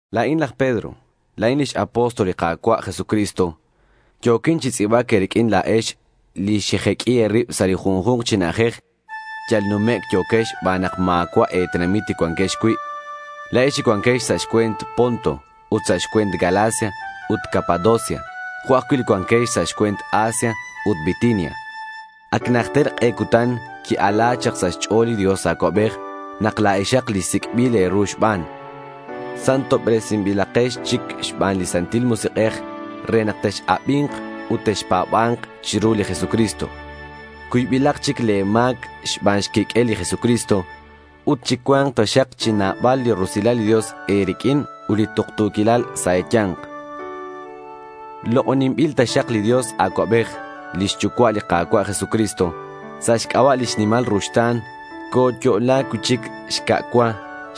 La̱in laj Pedro. La̱in x-apóstol li Ka̱cua' Jesucristo. Yo̱quin chi tz'i̱bac e̱riq'uin la̱ex, li xejeq'ui e̱rib sa' li junju̱nk chi na'ajej. Yal numec' yo̱quex xban nak ma̱cua' e̱tenamit li cuanquex cui', la̱ex li cuanquex sa' xcue̱nt Ponto, ut sa' xcue̱nt Galacia ut Capadocia, jo' ajcui' li cuanquex sa' xcue̱nt Asia ut Bitinia. Ac najter k'e cutan qui-ala chak sa' xch'o̱l li Dios Acuabej nak la̱exak li sic'bil e̱ru xban. Santobresinbilakex chic xban li Santil Musik'ej re nak tex-abi̱nk ut texpa̱ba̱nk chiru li Jesucristo. Cuybilak chic le̱ ma̱c xban xquiq'uel li Jesucristo. Ut chi cua̱nk taxak chi nabal li rusilal li Dios e̱riq'uin ut li tuktu̱quilal sa' e̱ya̱nk. Lok'oninbil taxak li Dios Acuabej, lix Yucua' li Ka̱cua' Jesucristo. Sa' xc'aba' lix nimal ruxta̱n, coyo'la cui'chic xca' cua.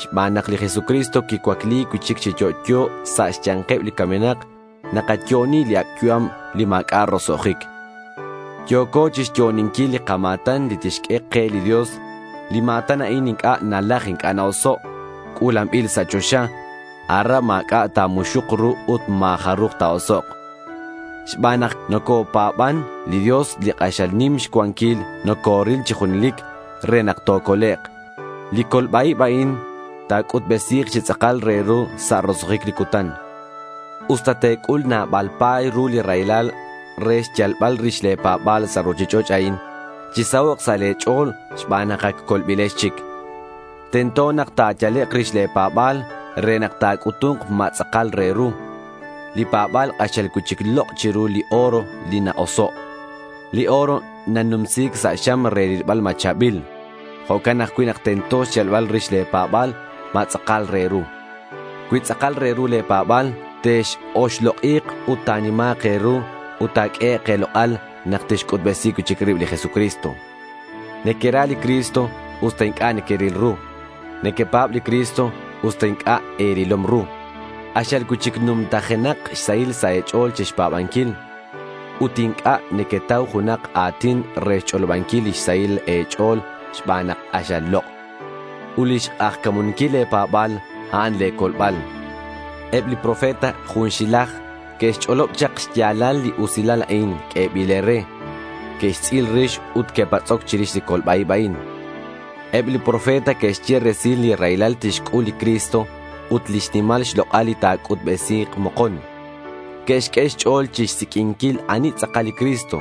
Xban nak li Jesucristo quicuacli cui'chic chi yo'yo sa' xya̱nkeb li camenak, nakayo'oni li ac' yu'am li ma̱c'a' roso'jic. Yo̱co chixyo'oninquil li kama̱tan li tixq'ue ke li Dios. Li ma̱tan a'in inc'a' nalaj inc'a' na-oso'. C'u̱lanbil sa' choxa. Aran ma̱c'a' ta̱muxuk ru ut ma̱ jaruj ta̱osok'. Xban nak nocopa̱ban, li Dios li k'axal nim xcuanquil nocoril chi junelic re nak tocolek'. Li colba-ib a'in ta̱c'utbesi̱k chi tz'akal re ru sa' roso'jic li cutan. Usta te̱c'ul nabal pa̱y ru li raylal re xyalbal rix le̱ pa̱ba̱l sa' ruchich'och' a'in, chisahok' sa' le̱ ch'o̱l xban nak ac colbilex chic. Tento nak ta̱yalek' rix le̱ pa̱ba̱l re nak ta̱c'utu̱nk ma tz'akal re ru. Li pa̱ba̱l k'axal cui'chic lok' chiru li oro li na-oso'. Li oro nanumsi̱c sa' xam re rilbal ma cha̱bil. Jo'can ajcui' nak tento xyalbal rix le̱ pa̱ba̱l ma tz'akal re ru. Cui tz'akal re ru le̱ pa̱ba̱l, tex-oxlok'i̱k ut ta̱nima̱k e̱ru ut ta̱q'uehek' e̱lok'al nak tixc'utbesi cui'chic rib li Jesucristo. Nequera li Cristo usta inc'a' nequeril ru. Nequepa̱b li Cristo, usta inc'a' e̱rilom ru. K'axal cui'chic numtajenak xsahil sa' e̱ch'o̱l chixpa̱banquil. Ut inc'a' nequetau junak a̱tin re xch'olobanquil lix sahil e̱ch'o̱l xban nak k'axal lok'. Ut lix k'ajca̱munquil le̱ pa̱ba̱l, a'an le̱ colbal. Eb li profeta junxilaj que'xch'olob chak xya̱lal li usilal a'in q'uebil e̱re. Que'xtz'il rix ut que'patz'oc chirix li colba-ib a'in. Eb li profeta que'xye resil li raylal tixc'ul li Cristo ut lix nimal xlok'al li ta̱c'utbesi̱k mokon. Que'xq'ue xch'o̱l chixsiq'uinquil ani tz'akal li Cristo.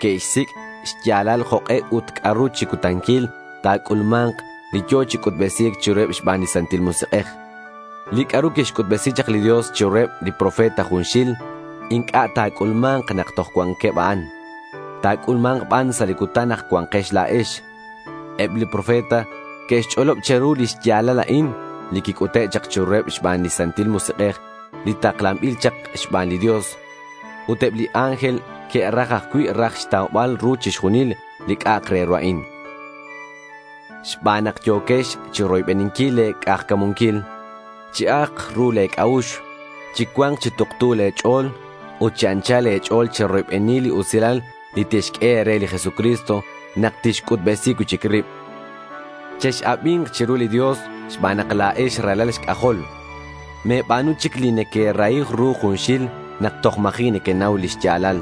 Que'xsic' xya̱lal jok'e ut c'a'ru chi cutanil ta̱c'ulma̱nk li yo̱ chi c'utbesi̱c chiruheb xban li Santil Musik'ej. Li c'a'ru quixc'utbesi chak li Dios chiruheb li profeta junxil inc'a' ta̱c'ulma̱nk nak toj cuanqueb a'an. Ta̱c'ulma̱nk ban sa' li cutan nak cuanquex la̱ex. Eb li profeta que'xch'olob che̱ru li xya̱lal a'in, li quic'ute' chak chiruheb xban li Santil Musik'ej li taklanbil chak xban li Dios. Ut eb li ángel que'raj ajcui' raj xtaubal ru chixjunil li c'a'ak re ru a'in. Xban nak yo̱quex chiroybeninquil le̱ k'ajca̱munquil, chi ajk ru le̱ c'a'ux. Chi cua̱nk chi tuktu le̱ ch'o̱l. Ut chi anchal e̱ch'o̱l cheroybeni li usilal li tixq'ue e̱re li Jesucristo nak tixc'utbesi cui'chic rib. Chex-abi̱nk chiru li Dios xban nak la̱ex ralal xc'ajol. Me̱ba̱nu chic li nequerahi ru junxil nak toj ma̱ji' nequenau li xya̱lal.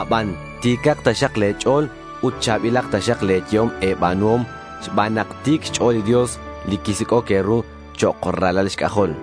Aban ti̱cak taxak le̱ ch'o̱l ut cha̱bilak taxak le̱ yehom e̱ba̱nuhom xban nak ti̱c xch'o̱l li Dios li quisic'oc e̱ru chok' ralal xc'ajol.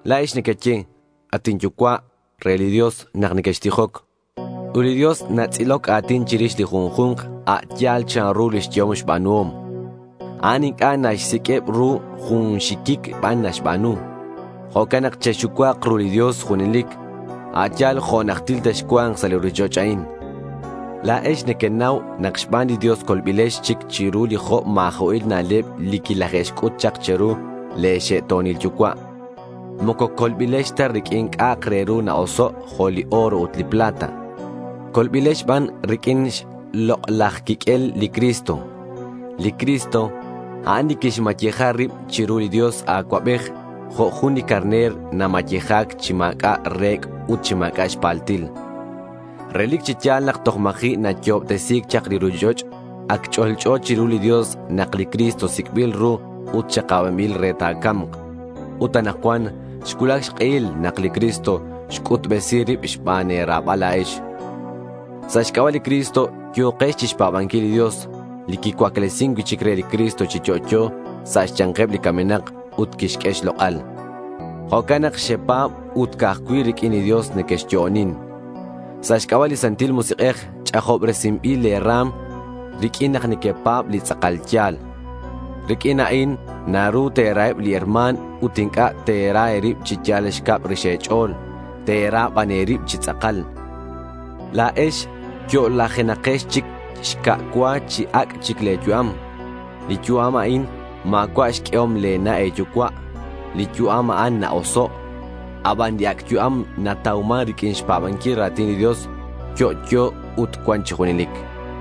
La̱ex nequeye “at inYucua'” re li Dios nak nequextijoc. Ut li Dios natz'iloc a̱tin chirix li junju̱nk a' yal chanru lix yehom xba̱nuhom. A'an inc'a' naxsiq'ueb ru. Jun xiquic ban naxba̱nu. Jo'can nak chexucua̱k ru li Dios junelic, a' yal jo' najtil texcua̱nk sa' li ruchich'och' a'in. La̱ex nequenau nak xban li Dios colbilex chic chiru li jo' ma̱jo'il na'leb li quilaje'xc'ut chak che̱ru le̱ xe'to̱nil yucua'. Moco colbilex ta riq'uin c'a'ak re ru na-oso' jo' li oro ut li plata. Colbilex ban riq'uin xlok'laj quiq'uel li Cristo. Li Cristo, a'an li quixmayeja rib chiru li Dios Acuabej jo' jun li carner namayeja̱c chi ma̱c'a' re̱c' ut chi ma̱c'a' xpaltil. Relic chi ya̱l nak toj ma̱ji' nayo'obtesi̱c chak li ruchich'och' ac ch'olch'o chiru li Dios nak li Cristo sic'bil ru ut xakabanbil re ta̱ca̱mk. Ut anakcuan xcuulac xk'ehil nak li Cristo xc'utbesi rib xban e̱ra̱bal la̱ex. Sa' xc'aba' li Cristo yo̱quex chixpa̱banquil li Dios, li quicuaclesin cui'chic re li Cristo chi yo'yo sa' xya̱nkeb li camenak ut quixq'ue xlok'al. Jo'can nak xepa̱b ut ca'aj cui' riq'uin li Dios nequexyo'onin. Sa' xc'aba' li Santil Musik'ej ch'ajobresinbil le̱ ra̱m riq'uin nak nequepa̱b li tz'akal ya̱l. Riq'uin a'in naru te̱raheb li herma̱n ut inc'a' te̱ra e̱rib chi yal xcab rix e̱ch'o̱l. Te̱ra ban e̱rib chi tz'akal. La̱ex yo'lajenakex chic xca' cua chi ac' chic le̱ yu'am. Li yu'am a'in ma̱cua' xq'uehom le̱ na' e̱yucua'. Li yu'am a'an na-oso'. Abanan li ac' yu'am natauman riq'uin xpa̱banquil ra̱tin li Dios. Yo'yo ut cuan chi junelic.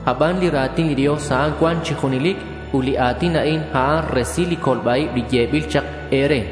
Aban li ra̱tin li Dios, a'an cuan chi junelic. Ut li a̱tin a'in, a'an resil li colba-ib li yebil chak e̱re.